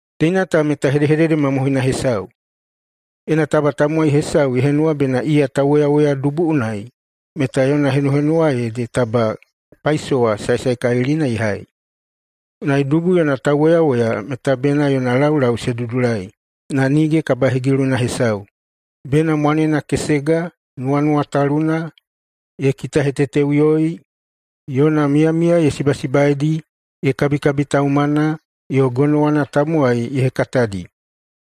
Teina ta meta hedehedede mamohoina hesau: “Ena taba tamowai hesau ye henuwa bena iya tauwoyawoya dubu unai, meta yona henuhenuwa ede taba paisowa saesaekalilina ye hai.” Unai dubu yona tauwoyawoya meta bena yona laulau se dudulai na nige kabahegiluna hesau, bena mwanena kesega, nuwanuwataluna, ye kitaheteteꞌuyoi, yona miyamiya ye sibasibaeidi, ye kabikabitaumana, yo gonowana tamowai ye hekatadi.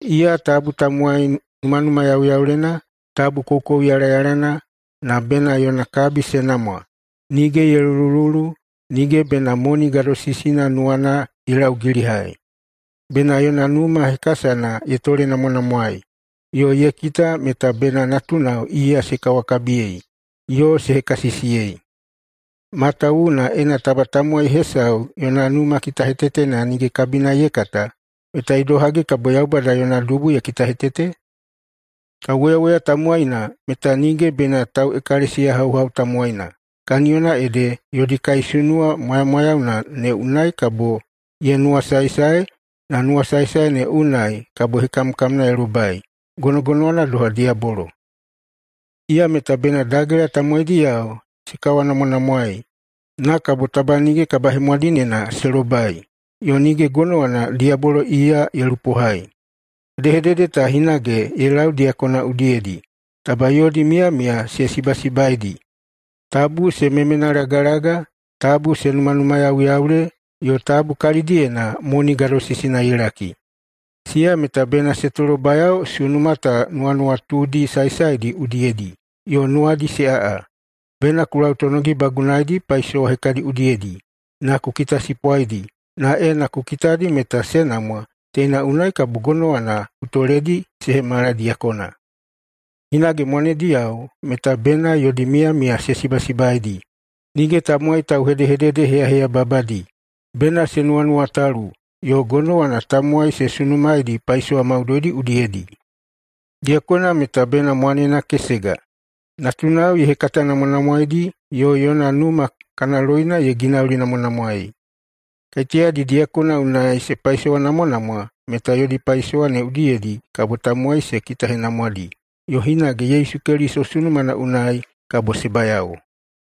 Iya tabu tamowai numanumayauyaulena, tabu koukouyalayalana, na bena yona kabi se namwa, nige ye lulululu, nige bena moni gadosisina nuwana ye laugilihai. Bena yona numa hekasana ye tolenamwanamwaei yo ye kita meta bena natunao iya se kawakabiyei yo se hekasisiyei. Matawuwuna, ena taba tamowai hesau yona numa kitahetetena nige kabina ye kata, meta idohagi kabo Yaubada yona dubu ye kitahetete? Tauwoyawoya tamowaina meta nige bena tauꞌekalesiyahauhau tamowaina, kaniyona ede yodi kaisunuwa mwamwayauyeina ne unai kabo ye nuwasaesae, na nuwasaesae ne unai kabo hekamkamna ye lobai gonogonowana doha diyabolo. Iya meta bena dagela tamowaidiyao se kawanamwanamwaei, na kabo taba nige kabahemwadineina se lobai, yo nige gonowana diyabolo iya ye lupohai. Hedehedede ta hinage ye lau diyakona udiyedi, taba yodi miyamiya se sibasibaeidi, tabu se memenalagalaga, tabu se numanumayauyaule, yo tabu kalidiyena moni gadosisina ye laki. Siya meta bena se tolobayao sunuma ta nuwanuwatudi saesaedi udiyedi yo nuwadi se aꞌa. Bena ku lautonogibagunaidi paisowa hekadi udiyedi, na ku kitasipwaidi, na ena ku kitadi meta se namwa, teina unai kabo gonowana ku toledi se hemala diyakona. Hinage mwanediyao meta bena yodi miyamiya se sibasibaeidi, nige tamowai tauhedehededeheyaheyababadi, bena se nuwanuwatalu, yo gonowana tamowai se sunumaedi paisowa maudoidi udiyedi. Diyakona meta bena mwanena kesega, natunao ye hekatanamwanamwaedi yo yona numa kana loina ye ginaulinamwanamwaei. Kaiteyadi diyakona unai se paisowanamwanamwa meta yodi paisowa ne udiyedi kabo tamowai se kitahenamwadi, yo hinage Yesu Keliso sunumana unai kabo se bayao.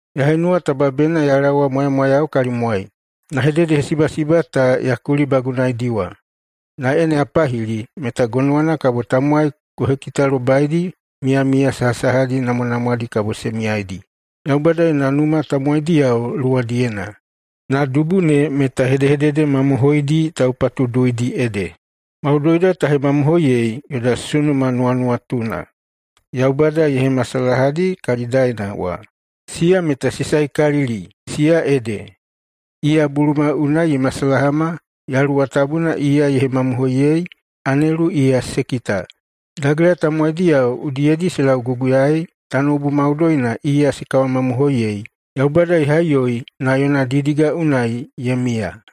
Ya henuwa taba bena ya laowa mwamwayau kalimwai, na hededehesibasiba ta ya kulibagunaediwa. Na ena ya pahili meta gonowana kabo tamowai ku hekitalobaidi miyamiya sahasahadi namwanamwadi kabo se miyaidi Yaubada yona numa tamowaidiyao luwadiyena. Numana ede Yaubada maumaulina yona dubu, na dubu ne meta hedehedede mamohoidi taupatuduuidi ede. Maudoida ta hemamohoiyei, yoda sunuma nuwanuwatuna Yaubada ye hemasalahadi kalidaena wa, siya meta se saekalili, siya ede: Iya buluma unai ye masalahama, Yaluwa Tabuna iya ye hemamohoiyei, anelu iya se kita, dagela tamowaidiyao udiyedi se lauguguyaei, tanoubu maudoina iya se kawamamohoiyei, Yaubada ye haiꞌuyoi na yona didiga unai ye miya.